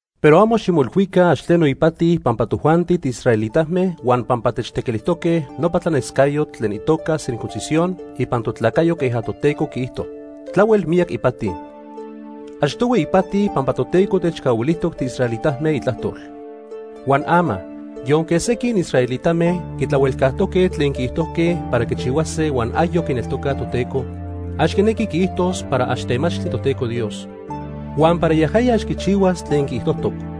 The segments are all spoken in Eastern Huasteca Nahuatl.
Pero amo ximoilhuica ax tleno ipati pampa tojuanti tiisraelitame huan pampa techtequilijtoque nopa tlanescayotl tlen itoca circuncisión ipan totlacayo queja Toteco quiijto. Tlahuel miyac ipati. Achtohui ipati pampa Toteco techcahuilijtoc tiisraelitame Itlajtol. Huan ama, yonque sequin israelitame quitlahuelcajtoque tlen quiijtojque para quichihuase huan ayoc quineltocaj Toteco, ax quinequi quiijtos para ax temachtli Toteco Dios, huan para yajaya ax quichihuas tlen quiijtojtoc.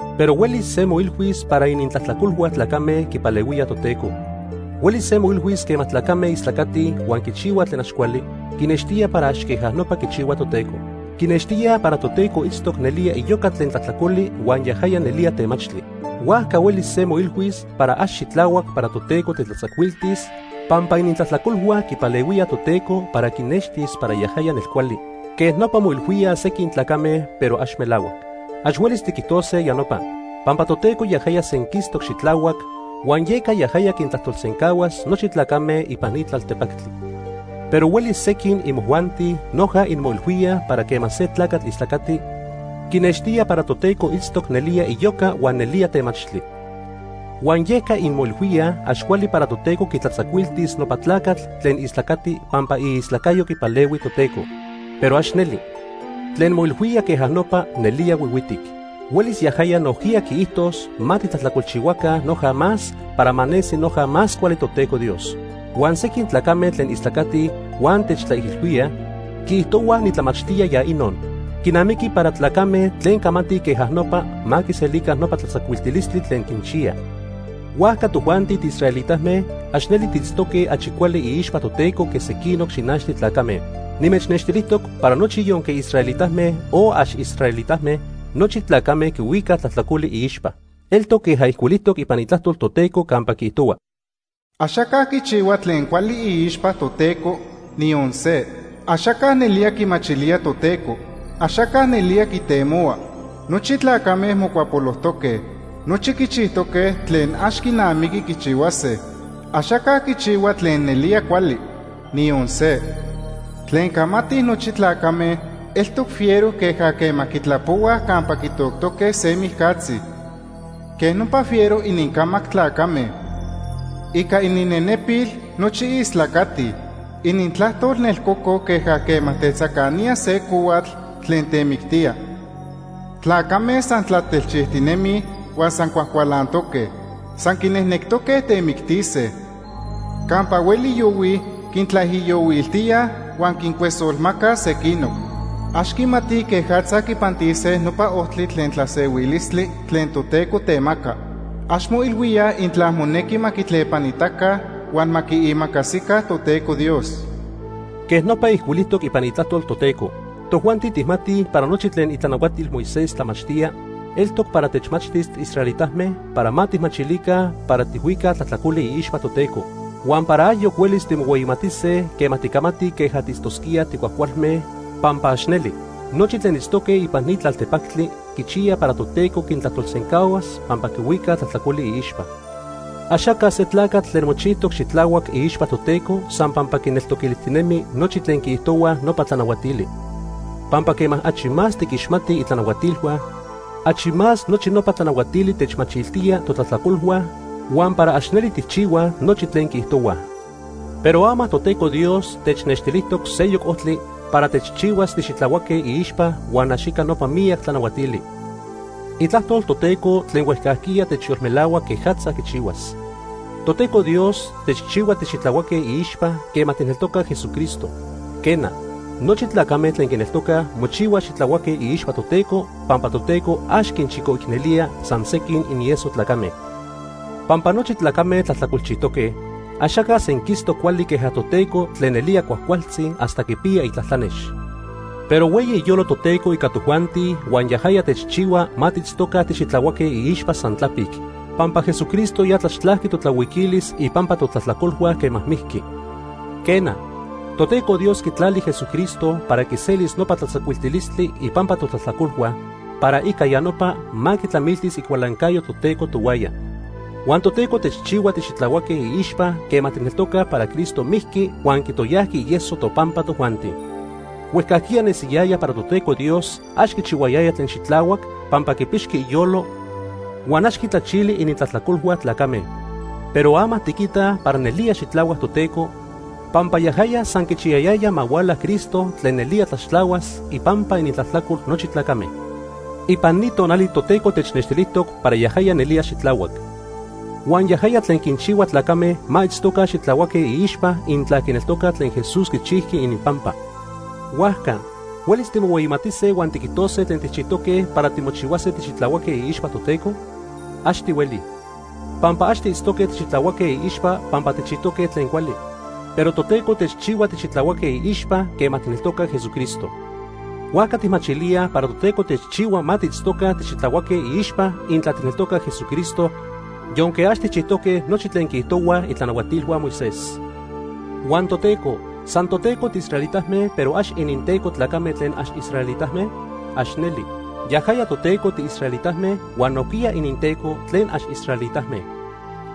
Pero huelis se moilhuis para inintlajtlacolhua tlacame quipalehuía Toteco. Huelis se moilhuis quema tlacame istlacatij huan quichihuaj tlen ax cuali, quinextía para ax queja nopa quichihua Toteco. Quinextíaj para Toteco itztoc nelía iyoca tlen tlajtlacoli huan yajaya nelía temachtli. Huajca huelis se moilhuis para ax xitlahuac para Toteco tetlatzacuiltis pampa inintlajtlacolhua quipalehuía Toteco para quinextis para yajaya nelcuali. Quej nopa moilhuíaj sequin tlacame, pero ax melahuac. Ax huelis tiquijtose ya nopa. Pampa Toteco yajaya senquistoc xitlahuac, huan yeca yajaya quintlajtolsencahuas nochi tlacame ipan ni tlaltepactli. Pero huelis sequin imojuanti noja inmoilhuíaj para quema se tlacatl istlacati, quinextía para Toteco itztoc nelía iyoca huan nelía temachtli. Huan yeca inmoilhuíaj ax cuali para Toteco quitlatzacuiltis nopa tlacatl tlen istlacati pampa iistlacayo quipalehui Toteco. Pero ax neli. Tlen moilhuía queja nopa nelía huihuitic. Huelis yajaya nojquiya quiijtos ma titlajtlacolchihuaca noja más para ma nesi noja más cuali Toteco Dios. Huan sequin tlacame tlen istlacatij huan techtlaijilhuíaj, quiijtohuaj nitlamachtía ya inon. Quinamiqui para tlacame tlen camatij queja nopa ma quiselica nopa tlatzacuiltilistli tlen quinchiya. Huajca tojuanti tiisraelitame ax neli tiitztoque achi cuali iixpa Toteco que sequinoc xinachtli tlacame. Nimechnextilijtoc para nochi yonque israelitame o ax israelitame, nochi tlacame quihuicaj tlajtlacoli iixpa. Eltoc queja ijcuilijtoc ipan Itlajtol Toteco campa quiijtohua: “Axaca quichihua tlen cuali iixpa Toteco, niyon se. Axaca nelía quimachilía Toteco. Axaca nelía quitemohua. Nochi tlacame mocuapolojtoque. Nochi quichijtoque tlen ax quinamiqui quichihuase. Axaca quichihua tlen nelía cuali. Niyon se. Tlen camatij nochi tlacame eltoc fiero queja quema quitlapohuaj campa quitoctoque se mijcatzi. Quej nopa fiero inincamac tlacame. Ica ininnenepil nochi istlacatij. Inintlajtol nelcococ queja quema tetzacanía se cohuatl tlen temictía. Tlacame san tlatelchijtinemij huan san cuajcualantoque. San quinejnectoque temictise. Campa hueli yohuij, quintlaijiyohuiltíaj huan quincuesolmacaj sequinoc. Ax quimatij quejatza quipantis nopa ojtli tlen tlasehuilistli tlen Toteco temaca. Ax moilhuíaj intla monequi ma quitlepanita huan ma quiimacasica Toteco Dios.” Quej nopa ijcuilijtoc ipan Itlajtol Toteco. Tojuanti tijmatij para nochi tlen itlanahuatil Moisés tlamachtíaj, eltoc para techmachtis tiisraelitame para ma tijmachilica para tijhuicaj tlajtlacoli iixpa Toteco, huan para ayoc huelis timohueyimatise quema ticamatij queja tiitztosquíaj ticuajcualme, pampa ax neli. Nochi tlen itztoque ipan ni tlaltepactli quichiyaj para Toteco quintlajtolsencahuas pampa quihuicaj tlajtlacoli iixpa. Axaca se tlacatl tlen mochijtoc xitlahuac iixpa Toteco san pampa quineltoquilijtinemi nochi tlen quiijtohuaj nopa tlanahuatili. Pampa quema achi más tiquixmatij itlanahuatilhua, achi más nochi nopa tlanahuatili techmachiltíaj totlajtlacolhua huan para ax neli tijchihuaj nochi tlen quiijtohuaj. Pero ama Toteco Dios technextilijtoc seyoc ojtli para techchihuas tixitlahuaque iixpa huan ax ica nopa miyac tlanahuatili. Itlajtol Toteco tlen huejcajquiya techyolmelahua quejatza quichihuas. Toteco Dios techchihua tixitlahuaque iixpa quema tijneltocaj Jesucristo. Quena, nochi tlacame tlen quineltocaj mochihuaj xitlahuaque iixpa Toteco pampa Toteco ax quinchicoicnelía san sequin inieso tlacame. Pampa nochi tlacame tlajtlacolchijtoque. Axaca senquistoc cuali queja Toteco tlen nelía cuajcualtzi hasta quipiya itlatlanex. Pero hueyi iyolo Toteco ica tojuanti huan yajaya techchihua ma tiitztoca tixitlahuaque iixpa san tlapic, pampa Jesucristo ya tlaxtlajqui totlahuiquilis ipampa totlajtlacolhua quema mijqui. Quena, Toteco Dios quitlali Jesucristo para quiselis nopa tlatzacuiltilistli ipampa totlajtlacolhua, para ica ya nopa ma quitlamiltis icualancayo Toteco tohuaya. Huan Toteco techchihua tixitlahuaque iixpa quema tijneltocaj para Cristo mijqui huan quitoyajqui ieso topampa tojuanti. Huejcajquiya nesiyaya para Toteco Dios ax quichihuayaya tlen xitlahuac pampa quipixqui iyolo huan ax quitlachili inintlajtlacolhua tlacame. Pero ama tiquitaj para nelía xitlahuac Toteco, pampa yajaya san quichiyayaya ma huala Cristo tlen nelía tlaxtlahuas ipampa inintlajtlacol nochi tlacame. Ipan ni tonali Toteco technextilijtoc para yajaya nelía xitlahuac. Huan yajaya tlen quinchihua tlacame ma itztoca xitlahuaque iixpa intla quineltocaj tlen Jesús quichijqui ininpampa. Huajca ¿huelis timohueyimatise huan tiquijtose tlen tijchijtoque para timochihuase tixitlahuaque iixpa Toteco? Ax tihueli. Pampa ax tiitztoque tixitlahuaque iixpa pampa tijchijtoque tlen cuali, pero Toteco techchihua tixitlahuaque iixpa quema tijneltocaj Jesucristo. Huajca tijmachilíaj para Toteco techchihua ma tiitztoca tixitlahuaque iixpa intla tijneltocaj Jesucristo, yonque ax tijchijtoque nochi tlen quiijtohuaj itlanahuatilhua Moisés. ¿Huan Toteco san toTeco tiisraelitame pero ax ininTeco tlacame tlen ax israelitame? ¡Ax neli! Yajaya Toteco tiisraelitame huan nojquiya ininTeco tlen ax israelitame.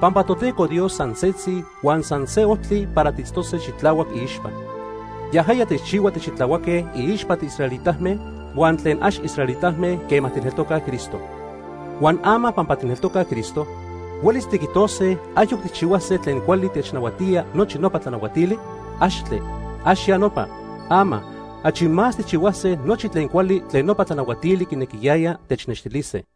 Pampa Toteco Dios san setzi huan san se ojtli para tiitztose xitlahuac iixpa. Yajaya techchihua tixitlahuaque iixpa tiisraelitame huan tlen ax israelitame quema tijneltocaj Cristo. Huan ama pampa tijneltocaj Cristo, ¿huelis tiquijtose ayoc tijchihuase tlen cuali technahuatía nochi nopa tlanahuatili? ¡Axtle! ¡Ax ya nopa! Ama, achi más tijchihuase nochi tlen cuali tlen nopa tlanahuatili quinequiyaya technextilise.